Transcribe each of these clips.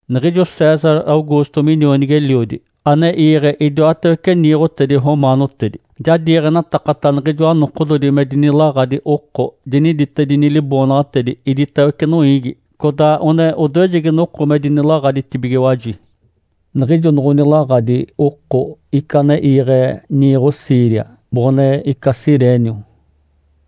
Niɡ̶ijo César Augusto minionigi-eliodi ane iiɡ̶e idiwatawece niiɡ̶otedi romaanotedi, ja diiɡ̶enatakata niɡ̶ijoa nokododi me dinilaɡ̶adi oko, diniditedini liboonaɡ̶atedi iditawece noiigi. Codaa one odoejegi noko me dinilaɡ̶aditibigiwaji. Niɡ̶ijo noɡ̶onilaɡ̶adi oko ica ane iiɡ̶e niiɡ̶o Síria boɡ̶one ica Cirênio.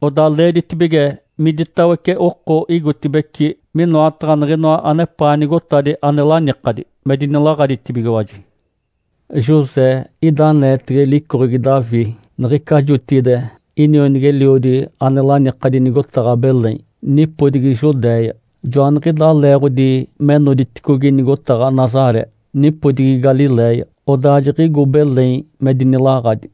Odaa leeditibige miditawece oko igotibeci minoataɡ̶a niɡ̶inoa anepaa nigotadi ane lanikadi, me dinilaɡ̶aditibigiwaji. José ida aneetege licoɡ̶egi Davi niɡ̶ica jotigide inionigi-eliodi ane lanikadi nigotaɡ̶a Belém, nipodigi Judéia. Joaniɡ̶idaa leeɡ̶odi me noditicogi nigotaɡ̶a Nazaré, nipodigi Galiléia, odaa jiɡ̶igo Belém me dinilaɡ̶adi.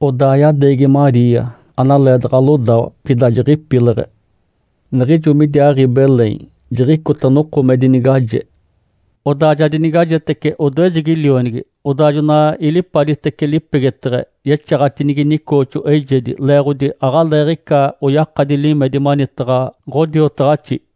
Odaa yadeegi Maria, analeedaɡ̶a lodawa, pida jiɡ̶ipileɡ̶e. Niɡ̶ijo midiaaɡ̶i Belém, jiɡ̶icota noko me dinigaje. Odaa ja dinigajetece odoejegi lionigi. Odaa jona ilipaditece lipegeteɡ̶e, yexaɡ̶atinigi nicooxo eijedi, leeɡ̶odi aɡ̶aleeɡ̶ica oyakadi limedi manitaɡ̶a ɡ̶odiotaɡ̶axi.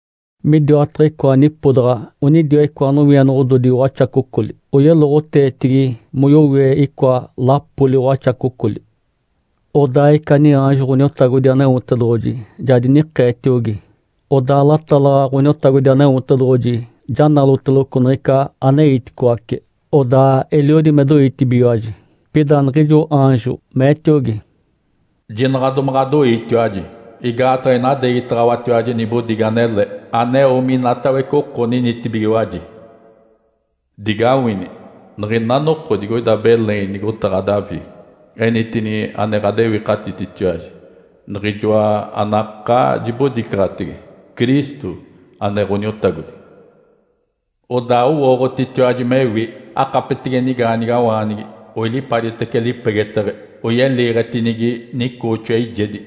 Midiwataɡ̶a icoa nipodaɡ̶a onidiwa icoa nowienoɡ̶ododi waxacocoli, oyeloɡ̶oteetigi moyowie icoa lapoli waxacocoli. Odaa ica niaanjo Ǥoniotagodi Aneotedoɡ̶oji ja dinikeetiogi, odaa latalaɡ̶a Ǥoniotagodi Aneotedoɡ̶oji ja naloteloco niɡ̶ica aneiticoace. Odaa eliodi me doitibigiwaji. Pida niɡ̶ijo aanjo meetiogi, “Jinaɡ̶a domaɡ̶adoiitiwaji! Igaataɡ̶a inadeegitaɡ̶awatiwaji nibodigi anele, aneo minatawece oko ninitibigiwaji. Digawini! Niɡ̶ina noko digoida Belém, nigotaɡ̶a Davi, enitini ane ɡ̶adewikatititiwaji, Niɡ̶ijoa anakaa jibodicaɡ̶atege, Cristo, ane Ǥoniotagodi. Odaa owooɡ̶otitiwaji mewi. Akapetege nigaanigawaanigi, oilipaditece lipegeteɡ̶e, oyeliiɡ̶etinigi nicooxo eijedi.”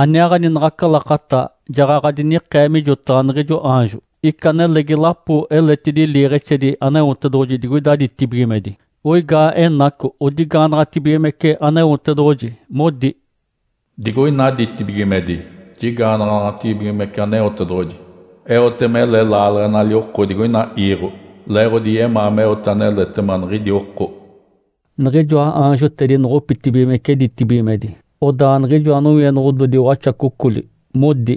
Aniaaɡ̶ani naɡ̶aca lakata jaɡ̶aɡ̶a dinikee mijotaɡ̶a niɡ̶ijo aanjo, ica nelegi lapo eletidi liiɡ̶exedi Aneotedoɡ̶oji digoida ditibigimedi. Oigaa enaco, odigaanaɡ̶atibigimece Aneotedoɡ̶oji, modi, “Digoina ditibigimedi jigaanaɡ̶anaɡ̶atibigimece Aneotedoɡ̶oji. Eote mele laaleɡ̶enali oko digoina iiɡ̶o, leeɡ̶odi yemaa meote aneletema niɡ̶idi oko.” Niɡ̶ijoa aanjotedi noɡ̶opitacibigimece ditibigimedi, odaa niɡ̶ijoa nowienoɡ̶ododi waxacocoli modi,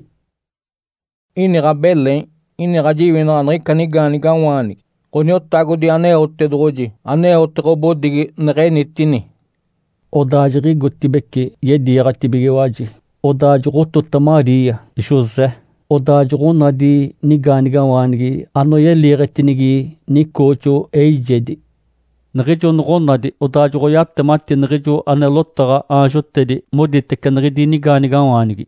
“Iniɡ̶a Belém, iniɡ̶a jiwinaɡ̶a niɡ̶ica nigaanigawaanigi Ǥoniotagodi Aneotedoɡ̶oji aneote ɡ̶obodigi neɡ̶enitini.” Odaa jiɡ̶igotibeci yediiɡ̶atibigiwaji, odaa joɡ̶otota Maria, José, odaa joɡ̶onadi nigaanigawaanigi, anoyeliiɡ̶etinigi nicooxo eijedi. Niɡ̶ijo noɡ̶onadi, odaa joɡ̶oyatemati niɡ̶ijo ane lotaɡ̶a aanjotedi moditece niɡ̶idi nigaanigawaanigi.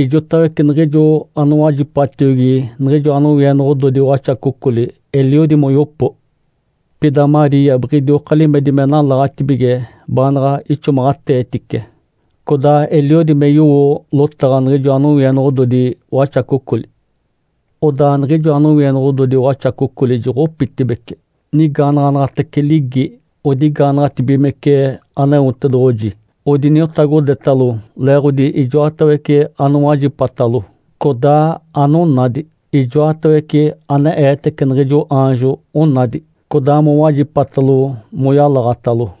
Ijotawece niɡ̶ijo anowajipatiogi niɡ̶ijoa nowienoɡ̶ododi waxacocoli eliodi moyopo. Pida Maria biɡ̶idioka limedi me nalaɡ̶atibige baanaɡ̶a ixomaɡ̶ateetice, codaa eliodi me yowo lotaɡ̶a niɡ̶ijoa nowienoɡ̶ododi waxacocoli. Odaa niɡ̶ijoa nowienoɡ̶ododi waxacocoli joɡ̶opitibeci. Nigaanaɡ̶anaɡ̶atece ligi, odigaanaɡ̶atibigimece Aneotedoɡ̶oji, odiniotagodetalo leeɡ̶odi ijoatawece anowajipatalo, codaa anonadi. Ijoatawece ane eetece niɡ̶ijo aanjo onadi, codaa mowajipatalo moyalaɡ̶atalo.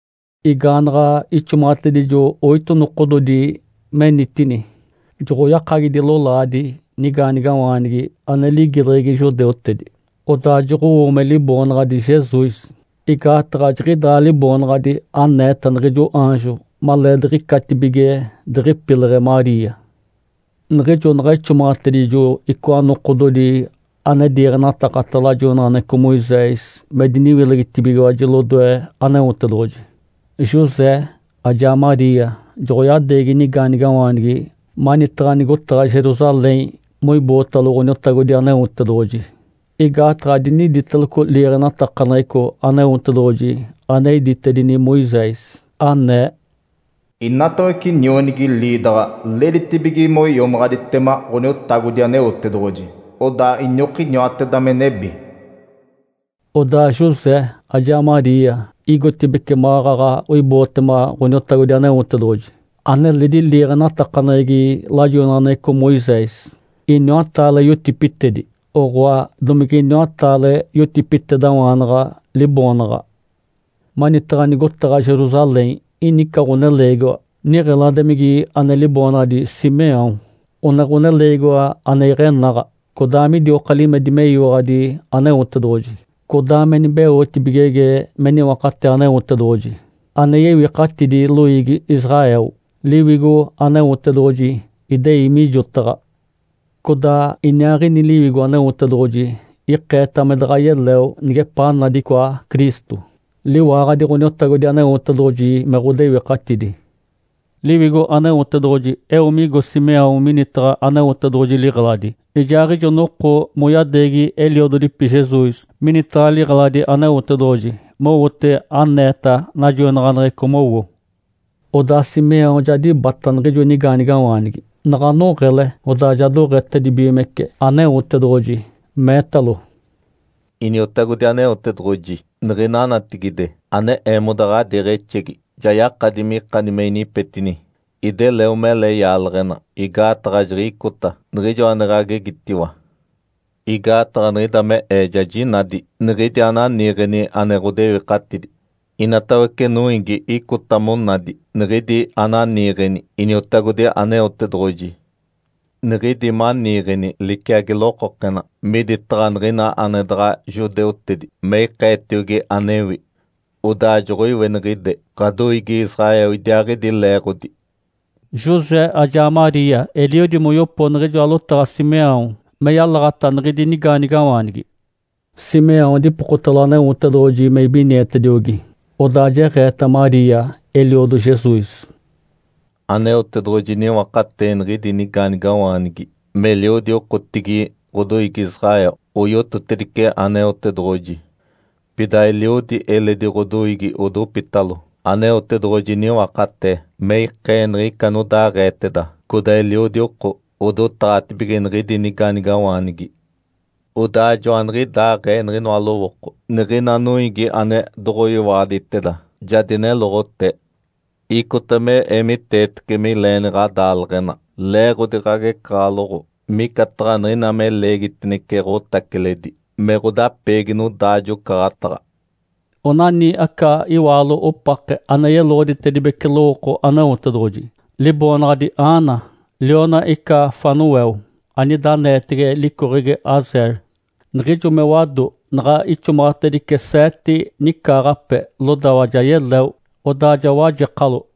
Igaanaɡ̶a ixomaɡ̶atedijo oito nokododi menitini, joɡ̶oyakagidi lolaadi nigaanigawaanigi ane ligileɡ̶egi judeutedi. Odaa joɡ̶owo me liboonaɡ̶adi Jesus, igaataɡ̶a jiɡ̶idaa liboonaɡ̶adi aneeta niɡ̶ijo aanjo maleediɡ̶icatibige diɡ̶ipileɡ̶e Maria. Niɡ̶ijo naɡ̶a ixomaɡ̶atedijo icoa nokododi ane diiɡ̶enatakata lajoinaɡ̶aneɡ̶eco Moisés me diniwilegitibigiwaji lodoe Aneotedoɡ̶oji, José ajaa Maria joɡ̶oyadeegi nigaanigawaanigi manitaɡ̶a nigotaɡ̶a Jerusalém moibootalo Ǥoniotagodi Aneotedoɡ̶oji. Igaataɡ̶a diniditeloco liiɡ̶enatakaneɡ̶eco Aneotedoɡ̶oji ane iditedini Moisés, anee, “Inatawece nionigi liidaɡ̶a leeditibige moiomaɡ̶aditema Ǥoniotagodi Aneotedoɡ̶oji, odaa iniokiniwateda me nebi.” Odaa José ajaa Maria igotibeci maɡ̶aɡ̶a oibootema Ǥoniotagodi Aneotedoɡ̶oji aneledi liiɡ̶enatakaneɡ̶egi lajoinaɡ̶aneɡ̶eco Moisés, iniwataale yotipitedi, oɡ̶oa domige iniwataale yotipitedawaanaɡ̶a liboonaɡ̶a. Manitaɡ̶a nigotaɡ̶a Jerusalém ini ica ɡ̶oneleegiwa niɡ̶eladimigi ane liboonaɡ̶adi Simeão. One ɡ̶oneleegiwa ane iɡ̶enaɡ̶a, codaa midioka limedi meyiwaɡ̶adi Aneotedoɡ̶oji, codaa me nibeotibigege me niwakatee Aneotedoɡ̶oji ane yewikatidi loiigi Israel. Liwigo Aneotedoɡ̶oji idei mijotaɡ̶a. Codaa iniaaɡ̶ini Liwigo Aneotedoɡ̶oji ikeeta me daɡ̶a yeleo nigepaa nadi icoa Cristo, liwaaɡ̶adi Ǥoniotagodi Aneotedoɡ̶oji me ɡ̶odewikatidi. Liwigo Aneotedoɡ̶oji eo migo Simeão minitaɡ̶a Aneotedoɡ̶oji liɡ̶eladi. Ijaaɡ̶ijo noko moyadeegi eliododipi Jesus minitaɡ̶a liɡ̶eladi Aneotedoɡ̶oji, mowote aneeta najoinaɡ̶aneɡ̶eco mowo. Odaa Simeão ja dibata niɡ̶ijo nigaanigawaanigi. Naɡ̶a noɡ̶ele, odaa ja doɡ̶etedibigimece Aneotedoɡ̶oji, meetalo, “Iniotagodi Aneotedoɡ̶oji, niɡ̶ina natigide, ane eemoda ɡ̶adiiɡ̶exegi ja yakadi mikani me inipetini. Ideleo mele yaaleɡ̶ena, igaataɡ̶a jiɡ̶icota niɡ̶ijo ane ɡ̶agegitiwa. Igaataɡ̶a niɡ̶ida me ee ja jinadi niɡ̶idi ananiiɡ̶eni ane ɡ̶odewikatidi. Inatawece noiigi icota monadi niɡ̶idi ananiiɡ̶eni Iniotagodi Aneotedoɡ̶oji. Niɡ̶idi maniiɡ̶eni liciagi lokokena miditaɡ̶a niɡ̶ina ane daɡ̶a judeutedi me ikeetiogi anewi. Odaa joɡ̶oiweniɡ̶ide ɡ̶adoiigi Israel idiaaɡ̶idi leeɡ̶odi.” José ajaa Maria eliodi moyopo niɡ̶ijoa lotaɡ̶a Simeão me yalaɡ̶ata niɡ̶idi nigaanigawaanigi. Simeão dipokotalo Aneotedoɡ̶oji me ibinietediogi, odaa jeɡ̶eeta Maria, eliodo Jesus, “Aneotedoɡ̶oji niwakatee niɡ̶idi nigaanigawaanigi meliodi okotigi ɡ̶odoiigi Israel oyototedice Aneotedoɡ̶oji, pida eliodi eledi ɡ̶odoiigi odopitalo. Aneotedoɡ̶oji niwakatee me ikee niɡ̶ica anodaaɡ̶eeteda. Codaa eliodi oko odotaɡ̶atibige niɡ̶idi nigaanigawaanigi. Odaa joaniɡ̶idaaɡ̶ee niɡ̶inoa lowooko niɡ̶ina noiigi ane doɡ̶oyiwaɡ̶aditeda ja dineloɡ̶otee. Icota me eemiteetece mileeni ɡ̶adaaleɡ̶ena leeɡ̶odi ɡ̶agecaɡ̶aloɡ̶o, micataɡ̶a niɡ̶ina me leegitinece ɡ̶otaciledi me ɡ̶odapeegi nodaajo-ocaɡ̶ataɡ̶a.” Onani aca iwaalo opake, ane yeloɡ̶oditedibece lowooko Aneotedoɡ̶oji. Liboonaɡ̶adi Ana, liona ica Fanuel, anida aneetege licoɡ̶egi Asa. Niɡ̶ijo me wado, naɡ̶a ixomaɡ̶atedice seete nicaaɡ̶ape, lodawa ja yeleo. Odaa ja wajekalo.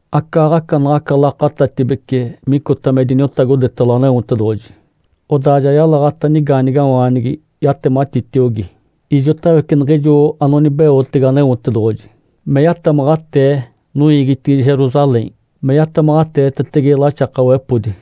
Acaaɡ̶aca naɡ̶aca lakatatibece micota me diniotagodetalo Aneotedoɡ̶oji, odaa ja yalaɡ̶ata nigaanigawaanigi yatematitiogi ijotawece niɡ̶ijo anonibeotege Aneotedoɡ̶oji me yatamaɡ̶atee noiigitigi Jerusalém me yatamaɡ̶ateetetege laxakawepodi.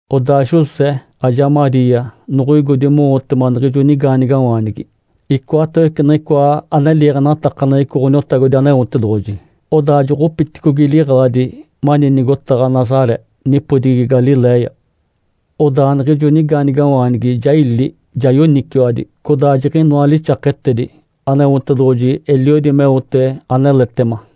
Odaa José ajaa Maria noɡ̶oigodi mowotema niɡ̶ijo nigaanigawaanigi icoatawece niɡ̶icoa ane liiɡ̶enatakaneɡ̶eco Ǥoniotagodi Aneotedoɡ̶oji, odaa joɡ̶opiticogi liɡ̶eladi mani nigotaɡ̶a Nazaré, nipodigi Galiléia. Odaa niɡ̶ijo nigaanigawaanigi ja ili, ja yoniciwadi. Codaa jiɡ̶inoa lixaketedi, Aneotedoɡ̶oji eliodi meote aneletema.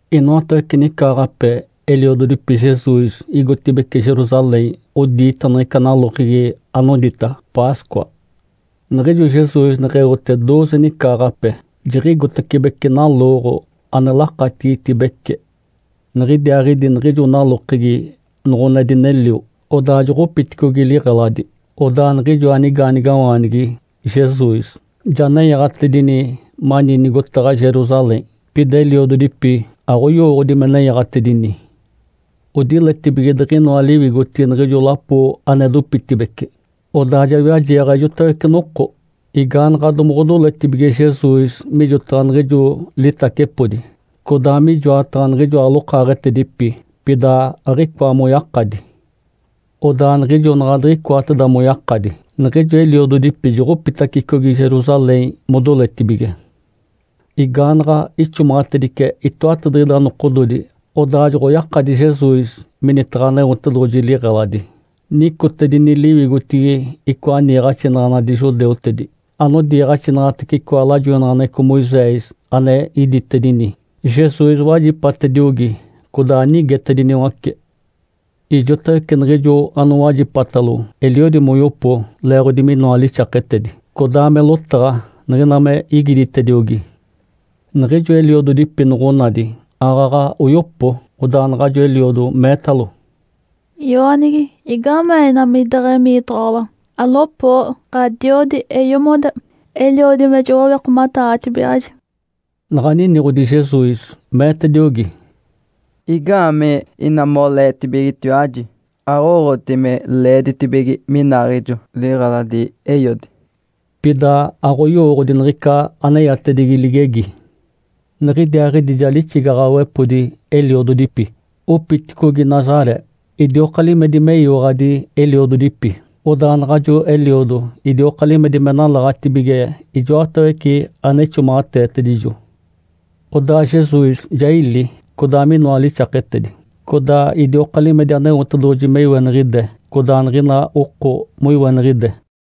Inoatawece nicaaɡ̶ape eliododipi Jesus igotibeci Jerusalém odiita niɡ̶ica nalokegi anodita “Páscoa”. Niɡ̶ijo Jesus neɡ̶eote dooze nicaaɡ̶ape, jiɡ̶igotacibece nalooɡ̶o ane lakatigitibece. Niɡ̶idiaaɡ̶idi niɡ̶ijo nalokegi noɡ̶one dinelio, odaa joɡ̶opiticogi liɡ̶eladi. Odaa niɡ̶ijoa nigaanigawaanigi, Jesus, ja nenyaɡ̶atedini mani nigotaɡ̶a Jerusalém. Pida eliododipi aɡ̶oyowooɡ̶odi me nenyaɡ̶atedini. Odiletibige diɡ̶inoa liwigotigi niɡ̶ijo lapo ane dopitibeci, odaa ja wiajeeɡ̶a ijotawece noko. Igaanaɡ̶a domoɡ̶odoletibige Jesus mijotaɡ̶a niɡ̶ijo litacepodi codaa mijoataɡ̶a niɡ̶ijoa lokaaɡ̶etedipi, pida aɡ̶icoa moyakadi. Odaa niɡ̶ijo naɡ̶a diɡ̶icoateda moyakadi, niɡ̶ijo eliododipi joɡ̶opitacicogi Jerusalém modoletibige. Igaanaɡ̶a ixomaɡ̶atedice itoatadiɡ̶ida nokododi, odaa joɡ̶oyakadi Jesus minitaɡ̶a Aneotedoɡ̶oji liɡ̶eladi. Nicotedini liwigotigi icoa niiɡ̶axinaɡ̶anadi judeutedi anodiiɡ̶axinaɡ̶atece icoa lajoinaɡ̶aneɡ̶eco Moisés ane iditedini. Jesus wajipatediogi codaa nigetediniwace. Ijotawece niɡ̶ijo anowajipatalo eliodi moyopo leeɡ̶odi minoa lixaketedi, codaa me lotaɡ̶a niɡ̶ina me igiditediogi. Niɡ̶ijo eliododipi noɡ̶onadi, aaɡ̶aɡ̶a oyopo. Odaa naɡ̶ajo eliodo meetalo, “I-oonigi, igaamee ina mideɡ̶emiitoɡ̶owa? Alopoo! Ǥadiodi, eeyomoda, eliodi me joɡ̶owikomataaɡ̶atibigaɡ̶aji.” Naɡ̶a niniɡ̶odi Jesus, meetediogi, “Igaamee ina moleetibigijitiwaji? Aɡ̶owooɡ̶oti me leeditibige minaaɡ̶ejo liɡ̶eladi Eiodi?” Pida aɡ̶oyowooɡ̶odi niɡ̶ica aneyatedigi ligegi. Niɡ̶idiaaɡ̶idi ja lixigaɡ̶awepodi eliododipi, opiticogi Nazaré, idioka limedi meyiwaɡ̶adi eliododipi. Odaa naɡ̶ajo eliodo idioka limedi me nalaɡ̶atibige ijoatawece ane ixomaɡ̶ateetedijo. Odaa Jesus ja ili, codaa minoa lixaketedi. Codaa idioka limedi Aneotedoɡ̶oji me iweniɡ̶ide codaa niɡ̶ina oko moiweniɡ̶ide.